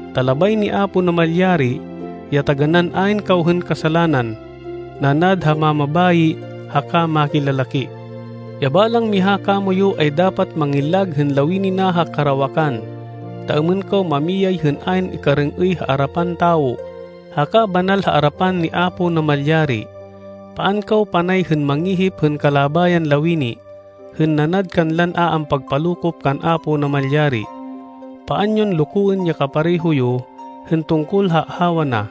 Ta labay ni Apo Namalyari ya taganán ayn kaw hên kasalanan, nanad ha mamabayi haka makilalaki. Ya balang miha kamoyu ay dapat mangillag hên lawini na ha karawakan, ta êmên kaw mamiyay hên ayn ikarêng-êy ha arapan tawo, haka banal ha arapan ni Apo Namalyari. Paan kaw panay hên mangihip hên kalabayan lawini, hên nanad kanlan a ampagpalokop kan Apo Namalyari. Paan yon lokoên ya kapareho yo hên tungkol ha ahawa na,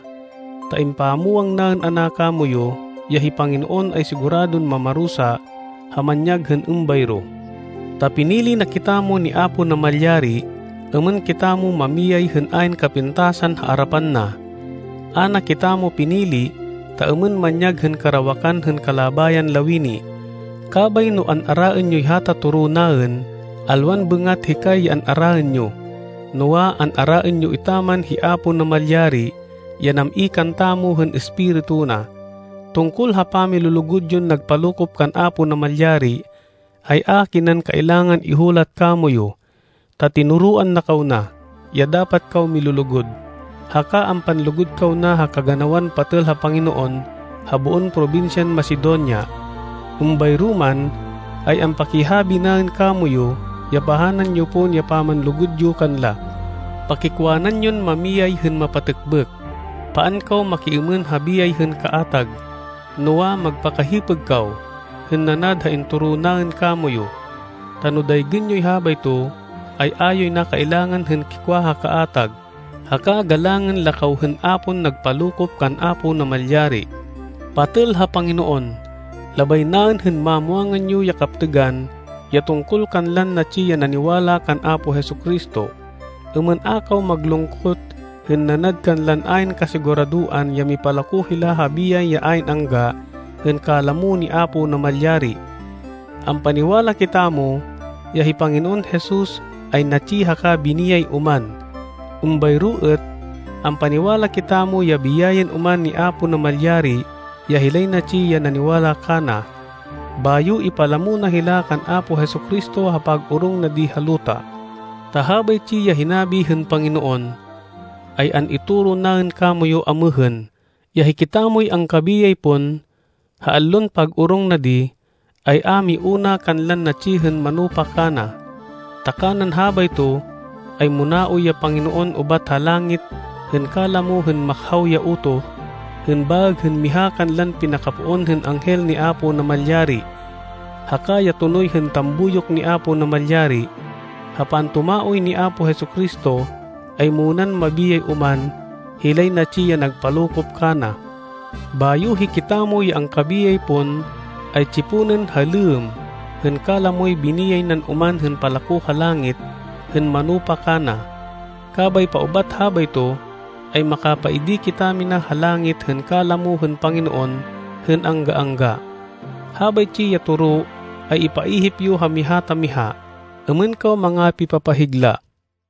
ta impamwang naên ana kamoyu, ya hi Panginoon ay siguradon mamarusa ha manyag hên êmbayro. Ta pinili na kitamo ni Apo Namalyari êmên kitamo mamiyay hên ayn kapintasan ha arapan na. A na kitamo pinili ta êmên manyag hên karawakan hên kalabayan lawini. Kabay no an-araên yoy hata toro naên, alwan bêngat hikay ya an-araên yo, noa, an-araên yo etaman hi Apo Namalyari ya nam-i kantamo hên Espiritu na. Tungkol ha pamilulugud yon nagpalokop kan Apo Namalyari, ay a kinan kailangan ihulat kamoyu, ta tinoroan na kaw na, ya dapat kaw milulugud. Haka ampanlugud kaw na ha kaganawan patêl ha Panginoon ha boon probinsyan Macedonia. Êmbayro man, ay ampakihabi naên kamoyu ya pahanan yo pon ya pamanlugud yo kanla. Pakikwanan yon mamiyay hên mapatêkbêk. Paan kaw makiêmên ha biyay hên kaatag, noa, magpakahipêg kaw, hên nanad ha intoro naên kamoyu. Ta no daygên yoy habayto, ay a yoy na kailangan hên kikwa ha kaatag, haka galangên la kaw hên a pon nagpalokop kan Apo Namalyari. Patêl ha Panginoon, labay naên hên mamwangan yo ya kaptêgan ya tungkol kanlan natsi ya naniwala kan Apo Jesu-Cristo, êmên a kaw maglungkot hên nanad kanlan ayn kasiguradoan ya mipalako hila ha biyay ya ayn angga hên kalamo ni Apo Namalyari. Ampaniwala kitamo ya hi Panginoon Jesus ay natsi haka biniyay oman. Êmbayro êt, ampaniwala kitamo ya biyayên oman ni Apo Namalyari ya hilay natsi ya naniwala kana. Bayo ipalamo na hila kan Apo Jesu-Cristo ha pag-orong na di ha luta. Ta habaytsi ya hinabi hên Panginoon, ay an-itoro naên kamoyu amêhên, ya hikitamoy angkabiyay pon, ha allon pag-orong na di, ay a miuna kanlan natsi hên manupa kana. Ta kanan habayto, ay muna-oy ya Panginoon ubat ha langit hên kalamo hên makhaw ya utoh, hên baêg hên miha kanlan pinakapoon hên anghel ni Apo Namalyari, haka ya tonoy hên tambuyok ni Apo Namalyari. Ha pantumaoy ni Apo Jesu-Cristo ay munan mabiyay oman, hilay natsi ya nagpalokop kana. Bayo hikitamo ya angkabiyay pon ay tsiponên ha lêmm hên kalamoy biniyay nan oman hên palako ha langit hên manupa kana. Kabay paubat habayto, ay makapaidi kitamina ha langit hên kalamo hên Panginoon hên angga-angga. Habaytsi ya toro ay ipaihip yo ha miha ta miha, êmên kaw mangapipapahigla.